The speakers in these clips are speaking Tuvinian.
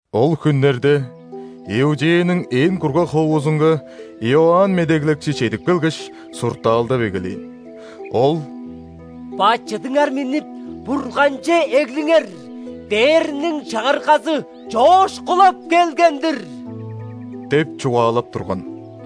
Ол хүннерде Иудеяның ээн кургаг ховузунга Иоанн Медеглекчи чедип келгеш, суртаалдап эгелээн. Ол: «Бачыдыңар миннип, Бурганче эглиңер! Дээрниң Чагыргазы чоокшулап келген-дир» – деп чугаалап турган.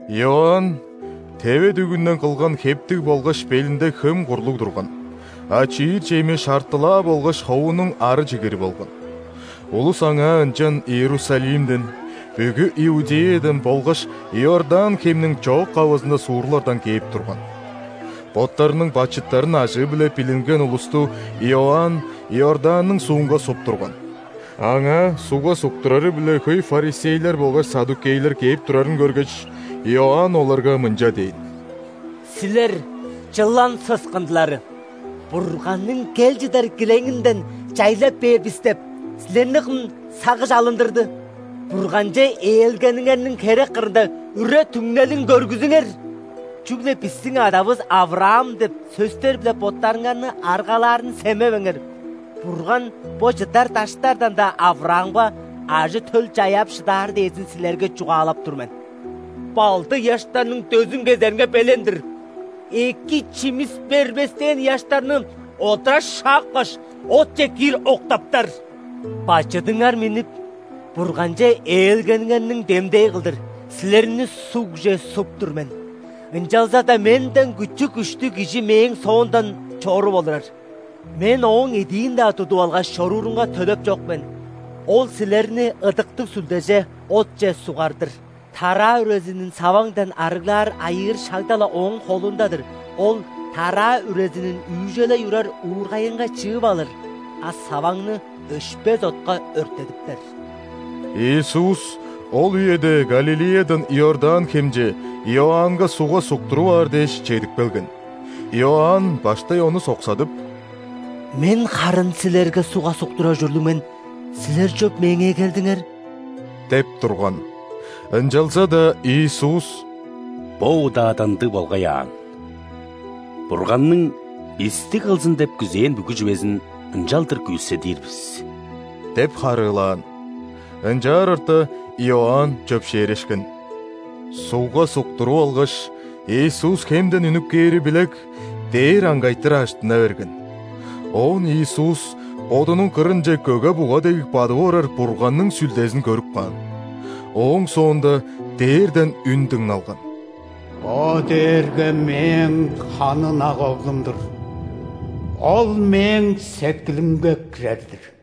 Иоанн теве дүгүнден кылган хептиг болгаш белинде хөм курлуг турган, а чиир чеми шартылаа болгаш ховунуң ары чигири болган. Улус аңаа ынчан Иерусалимден, бүгү Иудеядан болгаш Иордан хемниң чоок-кавызында суурлардан кээп турган. Боттарының бачыттарын ажыы-биле билинген улусту Иоанн Иорданның ·суунга суп турган. Аңаа сугга суктурары-биле хөй ·фарисейлер болгаш ·саддукейлер кээп турарын көргеш, Иоанн оларга мынча дээн: «Силер, чылан сыскындылары! „Бурганның кел чыдар килеңинден чайлай бээр бис“ деп, силерни кым сагыш алындырды? Бурганче ээлгениңерниң херек кырында үре-түңнелин көргүзүңер! Чүгле: „Бистиң адавыс – ·Авраам“ – деп сөстер-биле боттарыңарны аргалаарын семевеңер! Бурган бо чыдар даштардан-даа Авраамга ажы-төл чаяап шыдаар дээрзин силерге чугаалап тур мен. Балды ыяштарның дөзүн кезеринге белен-дир. Эки чимис бербестээн ыяштарны одура шапкаш, отче киир октаптар. Бачыдыңар миннип, Бурганче ээлгениңерниң демдээ кылдыр, силерни ·сугже суп тур мен. Ынчалза-даа менден күчү-күштүг Кижи мээң соомдан чоруп олурар. Мен Ооң идиин-даа тудуп алгаш чоруурунга төлеп чок мен. Ол силерни Ыдыктыг Сүлдеже, отче сугар-дыр. Тараа үрезинин саваңдан арыглаар айыыр шагда-ла Ооң холунда-дыр, Ол тараа үрезинин үүжелей урар уургайынга чыып алыр, а саваңны өшпес отка өрттедиптер». Иисус ол үеде Галилеядан Иордан хемче, Иоаннга ·сугга суктуруп аар дээш, чедип келген. Иоанн баштай Ону соксадып: «Мен харын Силерге сугга суктурар ужурлуг мен. Силер чоп меңээ келдиңер?» – деп турган. Ынчалза-даа Иисус: «Бо удаада ындыг болгай аан. Бурганның бисти кылзын деп күзээн бүгү чүвезин ынчалдыр күүседир бис» – деп харыылаан. Ынчаар орта, Иоанн чөпшээрешкен. Сугга суктуруп алгаш, Иисус хемден үнүп кээри билек, дээр аңгайтыр ажыттына берген. Оон Иисус Бодунуң кырынче көге-буга дег бадып орар Бурганның Сүлдезин көрүп каан. Ооң соонда дээрден үн дыңналган: «Бо дээрге Мээң ханы ынак оглум-дур, Ол Мээң сеткилимге кирер-дир!»